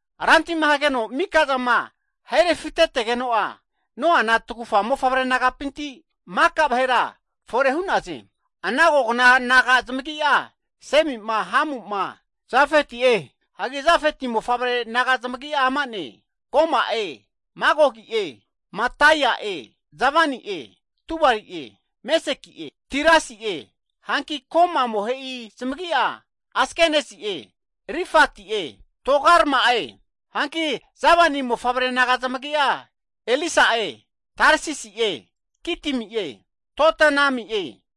Rantima hageno mika'zama ahe refitetegeno'a, Noana tagufa mofavre nagapinti maka'a vahera fore hu'naze. Ana kogna naga zamagi'a Semiki, Hamuki, Jafeti'e. Hagi Jafeti mofavre naga zamagi'a ama'ne, Goma'e, Magogi'e, Madai'e, Javani'e, Tubali'e, Meseki'e, Tirasi'e. Hanki Goma amohe'i zamagi'a Asikenazi'e, Rifati'e, Togarma'e. Hanki Javani mofavre naga zamagi'a Elisa'e, Tarsisi'e, Kitimi'e, Dodanimi'e.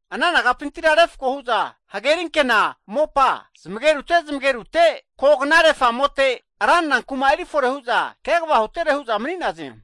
Ana nagapintira refko hu'za hagerinkena mopa zamagerute zamagerute kognare, famote ranra kuma erifore hu'za kegava hutere hu'za mani'naze.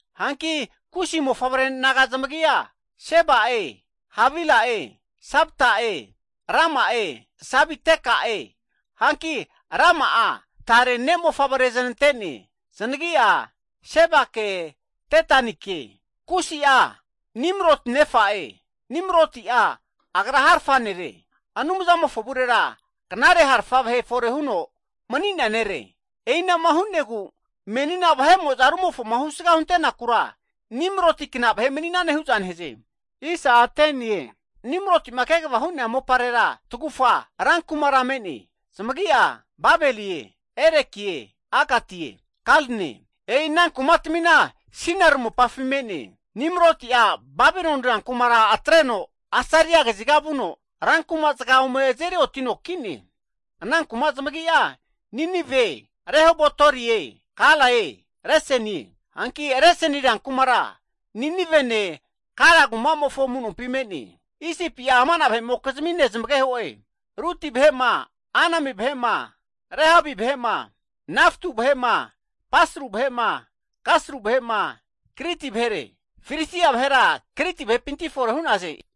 Hanki Kusi mofavre naga zamagi'a Seba'e, Havila'e, Sabta'e, Rama'e, Sabiteka'e. Hanki Rama'a tare ne'mofavre zanante'ne, zanagi'a Sebake Dedanike. Kusi'a, Nimiroti nefa'e. Nimiroti'a agra harafa nere. Anumzamofo avurera knare harafa vahe fore huno mani'nea nere. E'ina'ma hu'negu menina vahe'mo'za rumofoma husga huntenakura, Nimroti kna vahe mani'ne hu'za nehaze. Nimroti'ma kegava hu'nea moparera tagufa rankumara me'ne, zamagi'a Babelie, Erekie, Akatie, Kalne, e'i ana kumatmina Sinari (Babiloni) mopafi me'ne. Nimroti'a Babiloni rankumara atreno, Asiria kaziga vuno rankumazaga ome azeri otino ki'ne. Ana kuma zamagi'a Ninive, Rehobotirie, Kalae, Resenie. Hanki Reseni rankumara Ninivene, Kala kumamofo amu'nompi me'ne. Isipi'a amana vahe'mokizmi nezamageho'e, Luti vahe'ma, Anami vahe'ma, Lehabi vahe'ma, Naftu vahe'ma, Pasru vahe'ma, Kaslu vahe'ma, Kriti vahere. Filistia vahera Kriti vahepinti fore hu'naze.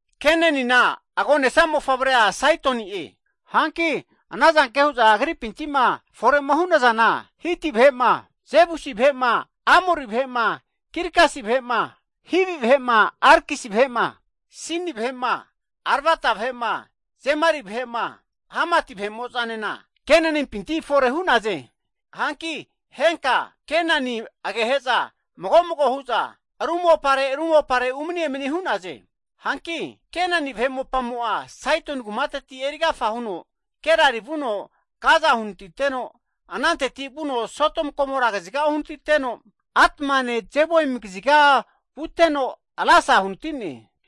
Kenanina agonesa mofavrea Saidoni'e, hanki anazanke hu'za agripinti'ma fore'ma hu'nazana Hiti vahe'ma, Jebusi vahe'ma, Amori vahe'ma, Girgasi vahe'ma, Hivi vahe'ma, Arkisi vahe'ma, Sini vahe'ma, Arvada vahe'ma, Zemari vahe'ma, Hamati vahe'mo'zanena Kenanimpinti fore hu'naze. Hanki henka Kenani, agehe'za mago mago hu'za ru mopare ru mopare umani emani hu'naze. Hanki Kenani vahe mopamo'a, Saidoni kumateti eri agafa huno Gerari vuno Gaza uhanatiteno, ananteti vuno Sodom Gomora kaziga uhanatino, Admane, Zeboim kaziga vuteno Lasa uhanati'ne.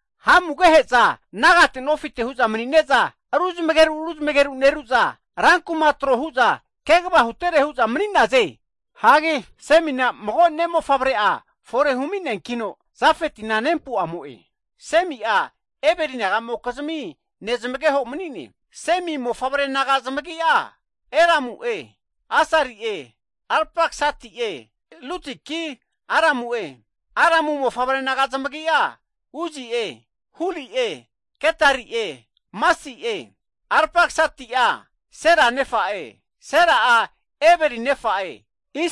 Hamu agehe'za nagate nofite hu'za mani'neza ruzmegeru ruzmegeru neru'za rankuma trohu'za kegava hutere hu'za mani'naze. Hagi Semina mago'a ne'mofavre'a fore humi'neankino, Jafetina nempu amo'e. Semi'a Eberi nagamokizmi nezamageho mani'ne. Semi mofavre naga zamagi'a, Elamu'e, Asari'e, Arpaksadi'e Ludiki, Aramu'e. Aramu mofavre naga zamagi'a Uzi'e, Huli'e, Getari'e, Masi'e. Arpaksadi'a Sela nefa'e, Sela'a Eberi nefa'e.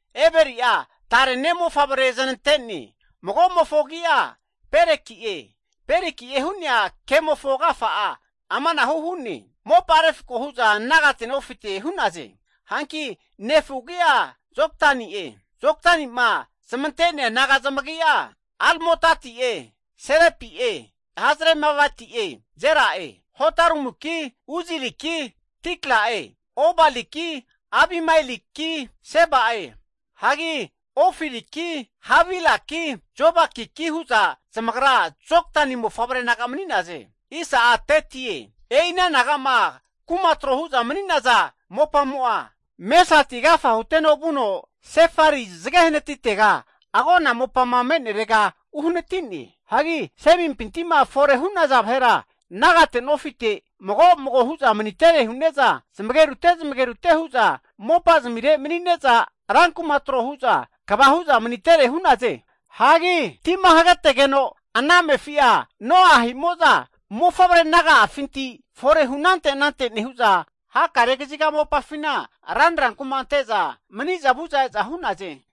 Eberi'a tare ne' mofavre zanante'ne. Mago'mofo agi'a Peleki'e, Peleki'e hu'nea agimofo agafa'a amanahu hu'ne, mopa refko hu'za nagate nofite hu'naze. Hanki nefu agi'a Joktani'e. Joktani'ma zamante'nea naga zamagi'a, Almodati'e, Selepi'e, Hazarmaveti'e, Jera'e, Hadoramuki, Uzaliki, Dikla'e, Obaliki Abimaeliki, Seba'e. Hagi Ofiriki, Havilaki, Jobabiki hu'za zamagra Joktani mofavre naga mani'naze. E'i ana naga'ma kuma tro hu'za mani'naza mopamo'a Mesati agafa huteno vuno, Sefari zage hanatitega agona mopama me'nerega uhanatine. Hagi Semimpinti'ma fore hu'naza vahera nagate nofite mago mago hu'za manitere hu'ne'za zamagerute zamagerute hu'za mopa zamire mani'ne'za, rankuma trohu'za kegava hu'za manitere hu'naze. Hagi tima hagetegeno ana amefi'a Noa ahi'mo'za mofavre naga'afinti forehu anante anante nehu'za, hakare kaziga mopafina ranra kuma ante'za maniza vu'za e'za hu'naze.